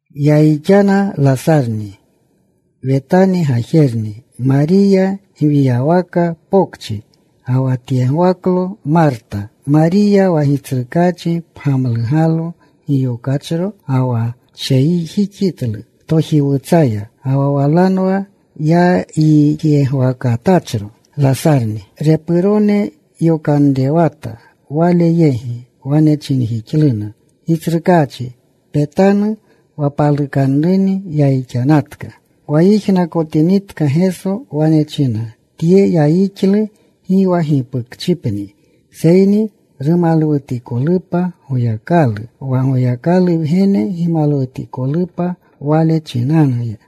Yayixana Lasarni, Wetani gajerni, Mariya gwiyawaka pokchi, ga wa tyegwaklo Marta. Mariya, wa Gitsrukaachi pgamlugalo giyokachro, ga wa tsheyjixitlu tojiwutsaya ga ga walanwa yayixyegwakatachro Lasarni. Repurone yokanrewata Wale yegi. Wane chinjixluna, “Gitsrukaachi, petanu, wa palukanruni yayixanatka.” Wa yijnakotinitka Geso wane china, “Tye yayixlu, gi wa gipukchipni seyni rumalwutikolupa Goyakalu, wa Goyakalu Wgene gimalwutikolupa Wale chinanuya.”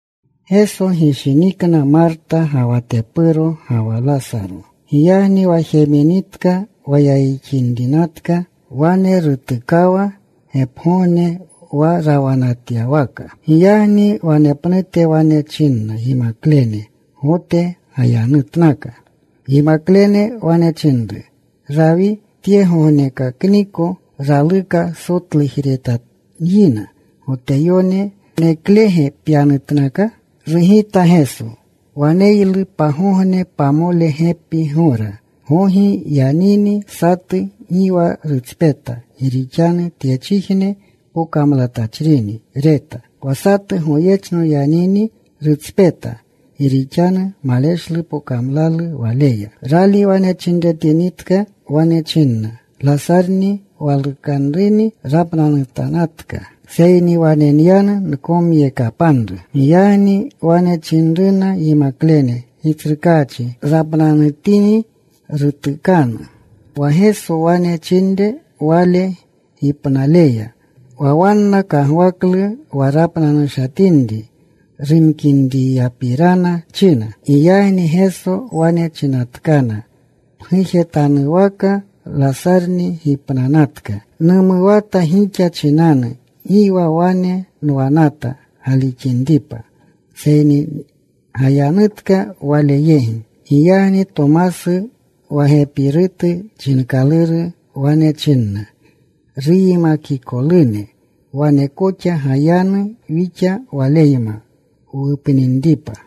Geso gishinikna Marta, ga wa tepuro, ga wa Lasaro. Giyagni wa jeminitka wa yayixinrinatka, wane rutukawa gepgogne wa rawanatyawaka. Giyagni wanepnute wane chinna yimaklene, “Gote gayanutnaka.” Yimaklene wane chinru, “Rawi, tyegognekakniko, raluka sotlujeretanyina Goteyone. ¿Waneklege pyanutnaka?” Rugita Geso, “Waneylu pagogne pamole gepi gora. Gogi yanini satu, gi wa rutspeta, gi rixanu tyechijne pokamlatachini reta. Wa satu goyechno yanini rutspeta, gi rixanu maleshlu pokamlalu waleya.” Rali wane chinretinitka, wane chinna, “Lasarni, walukanru, rapnanutatka. Seyni wane nyanu. Nkomyekapanru.” Giyagni wane chinruna yimaklene, “Gitsrukaachi, rapnanutini, rutukanu.” Wa Geso wane chinre wale gipnaleya. Wa wanna kagwaklu wa rapnanushatinri rumkinriyapirana, china. Giyagni Geso wane chinatkana pgujetanwaka, “Lasarni gipnanatka. Numuwata gixa chinanu, gi wa wane nwanata, galixinripa. Seyni gayanutka wale yegi.” Giyagni Tomasu wa Gepirutu chinkaluru wane chinna ruyimakikolune, “Wane koxa gayanu wixa Waleyma wupninripa.”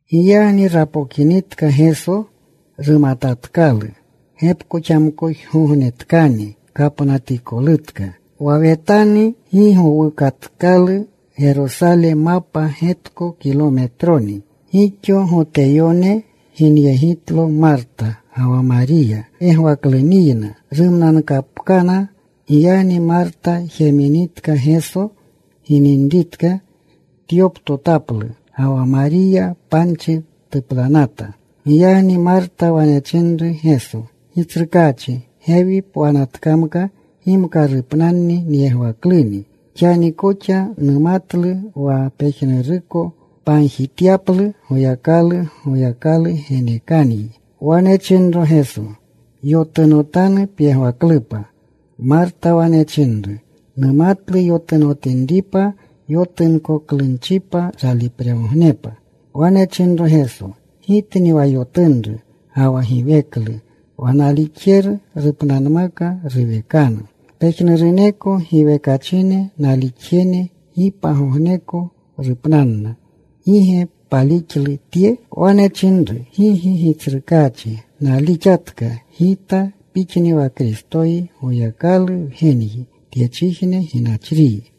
Giyagni rapokinitka Geso, rumatatkalu gepkoxamkojgognetkani kapnatikolutka. Wa Wetani gi gowukayatkalu Gerosale, mapa getko kilometroni. Gixo Goteyone ginyegitlo Marta ga wa Mariya yegwakluniyna rumnankapkana. Giyagni Marta jeminitka Geso gininritka, tyoptotaplu. Ga wa Mariya panchi tuplanata. Giyagni Marta wane chinru Geso, “Gitsrukaachi, gewi pwanatkamka, gimka rupnanni nyegwakluni. Xani koxa numatlu wa pejnuruko pagjityaplu Goyakalu, Goyakalu genekanyi.” Wane chinro Geso, “Yotunotanu pyegwaklupa.” Marta wane chinru, “Numatlu yotunotinripa yotunkoklunchipa ralipregognepa.” Wane chinro Geso, “Gitni wa yotunru ga wa giweklu. Wa nalixjeru rupnanmaka, ruwekanu. Pejnuruneko giwekachine nalixjene gi pagogneko rupnanna. ¿Gi ge palixlu tye?” Wane chinru, “Gigi, Gitsrukaachi. Nalixatka gita Pixni wa Kristoyi, Goyakalu Wgenyi, tyechijne ginachriyi.”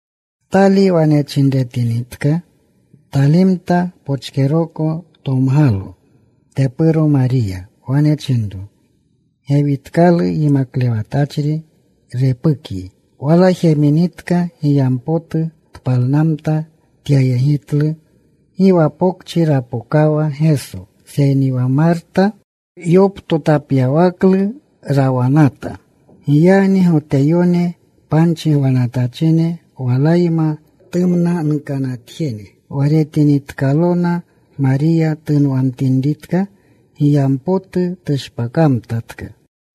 Tali wane chinretinitka, talimta. Pochkeroko tomgalo tepuro Mariya. Wane chinro, “Gewitkalu Yimaklewatachri. Repukyi.” Wala jeminitka, giyampotu tpalnamta. Tyayegitlu. Gi wa pokchi rapokawa Geso, seyni wa Marta yoptotapyawakaklu rawanata. Giyagni Goteyone panchi gwanatachine walayma tumnanukanatjene, wa retinitkalona Mariya tunwamtinritka giyampotu, tushpakamtatka,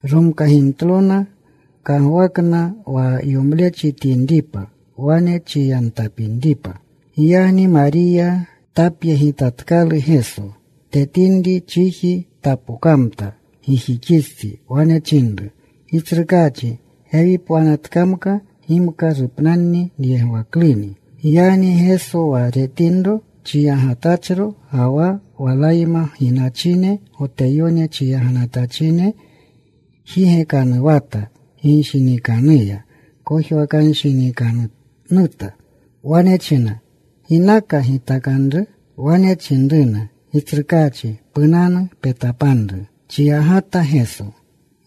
romkagimtlona. Kagwakna wa yomlechi tyinripa wane chiyamtapinripa. Giyagni Mariya tapyegitinitkalu Geso, tetinri, chiji tapokamta gijixistsi. Wane chinru, “Gitsrukaachi, gewi pwanatkamka, gimka rupnanni nyegwakluni.” Giyagni Geso wa retinro chiyagatachro, ga wa walayma ginachine Goteyone chiyaganatachine jigekanuwata ginshinikanuya. Kojwakanshinikanuta. Wane china, “¿Ginaka gitakanru?” Wane chinruna, “Gitsrukaachi, punanu. Petapanru.” Chiyagata Geso.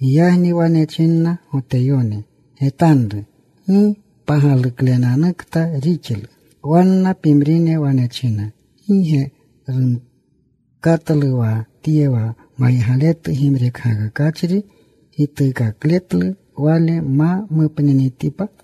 Giyagni wane chinna Goteyone, “¡Getanru! ¡Gi pagaluklenanukta rixlu!” Wanna pimrine wane china, “¿Gi ge rumkatlu wa Tye wa maygaletu gimrekgakakachri, gituukakletlu wale ma mupninitipa?”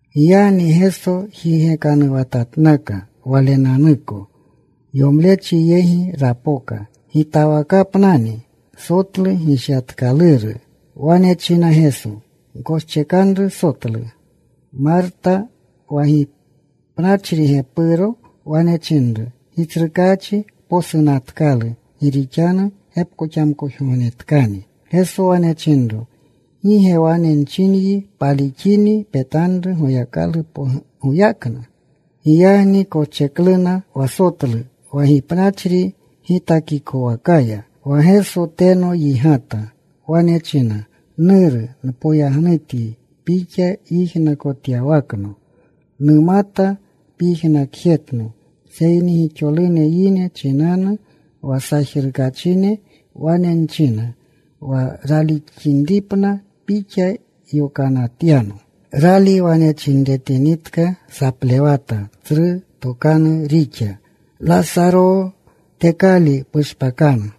Giyagni Geso jigekanuwatatnaka Walenanuko. Yomlechi yegi rapoka. Gitawakapnani, sotlu gishyatkaluru. Wane china Geso, “Gkoschekanru sotlu.” Marta, wa gipnachri gepuro wane chinru, “Gitsrukaachi posunatkalu, gi rixanu gepkoxamkojgognetkani.” Geso wane chinro, “¿Gi ge wane nchinyi, palixini petanru Goyakalu goyaknu?” Giyagni koschekluna wa sotlu wa gipnachri gitakikowakaya. Wa Geso teno yigata. Wane china, “Nuru, npoyagnutyi Pixa yijnakotyawakno. Numata pyijnakjetno. Seyni gixolune yine chinanu wa sajrukachine, wane nchina, wa ralixinripna Pixa yokanatyano.” Rali wane chinretinitka, saplewata. Tsru tokanu rixa, “Lasaroo, tekali. Pushpakanu.”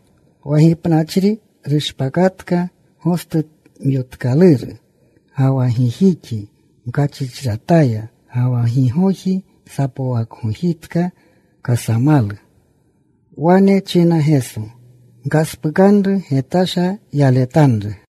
Wa gipnanatachri rushpakatka, gostumyotkaluru, ga wa gijixi mkachrichrataya. Ga wa gigoji sapwakgojitka kasamalu. Wane chinna Geso, “Gkaspukanru. Getasha yaletanru.”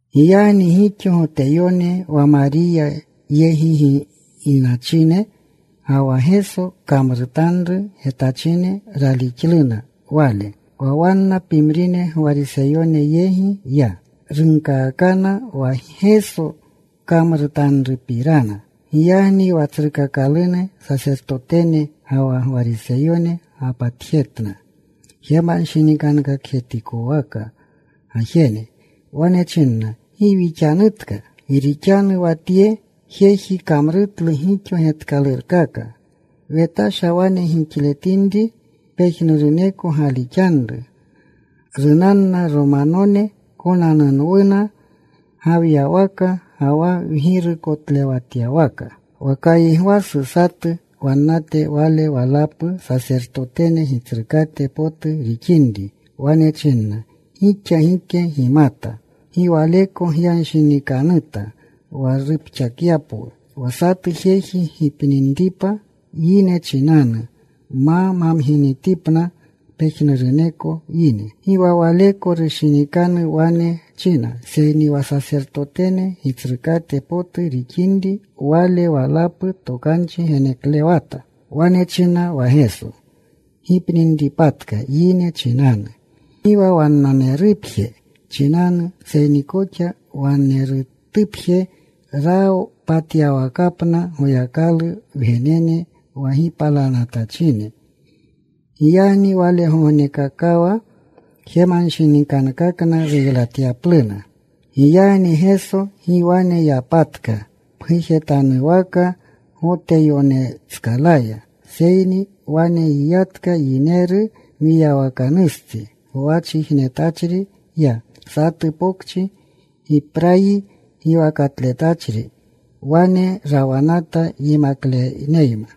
Giyagni gixo Goteyone wa Mariya yegi ginachine, ga wa Geso kamrutanru getachine ralixluna Wale. Wa wanna pimrine Gwariseyone yegi ya. Runkaakana wa Geso kamrutanrupirana. Giyagni wa tsrukakalune sasertotene ga wa Gwariseyone gapatjetna jemanshinikankakjetikwaka gajene. Wane chinna, “¿Gi wixanutka? Gi rixanu wa tye jeji kamrutlu gixo getkalurkaka. Wetasha wane gixletinri pejnuruneko galixanru. Runanna Romanone. Konanunwuna gawiywaka ga wa wgirukotlewatyawaka.” Wa Kaygwasu, satu wannate, wale walapu sasertotene gitsrukate potu rixinri, wane chinna, “Gixa gike gimata. Gi waleko gyanshinikanuta wa rupxakyapwu wa satu jeji gipninripa yine chinanu, ma mamginitipna pejnuruneko yine.” Gi wa waleko rushinikanu wane china, seyni wa sasertotene gitsrukate potu rixinri wale walapu, tokanchi reneklewata. Wane china wa Geso gipninripatka yine chinanu. Gi wa wannanerupje chinanu, seyni koxa wanerutupje rapatyawakapna Goyakalu wgenene wa gipalanatachine. Giyagni walgogneyakawa jemanshinikankakna ruylatyapluna. Giyagni Geso gi wane yapatka pgujetanwaka Goteyonetskalaya, seyni wane yiyatka. Yineru mwiyawakanustsi gwachijnetachri ya, satu pokchi Giprayi giwakatletachri. Wane rawanata yimakleneyma.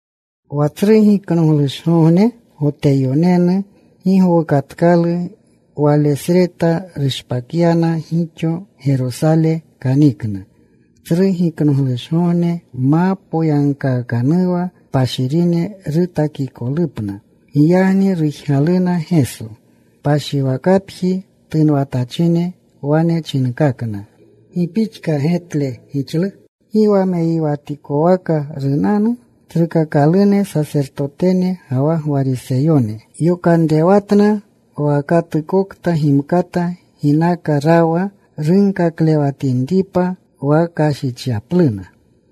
Wa Tsru Giknoglushgogne Goteyonenu gi gowukatkalu. Walesreta rushpakyana gixo. Gerosale kanikna, Tsru Giknoglushgogne ma mapookanuwa, kpashirine rutakikolupna. Giyagni rujgaluna Geso. Kpashiwakapjiya tunwatachine wane chinkakna, “¿Gi pixka getle gixlu? ¿Gi wa meyiwatikwaka runanu?” Tsrukakalune sasertotene ga wa Gwariseyone yokanrewatna, wa katukokta gimata ginaka rawa, runkaklewatinripa wa kashichyapluna.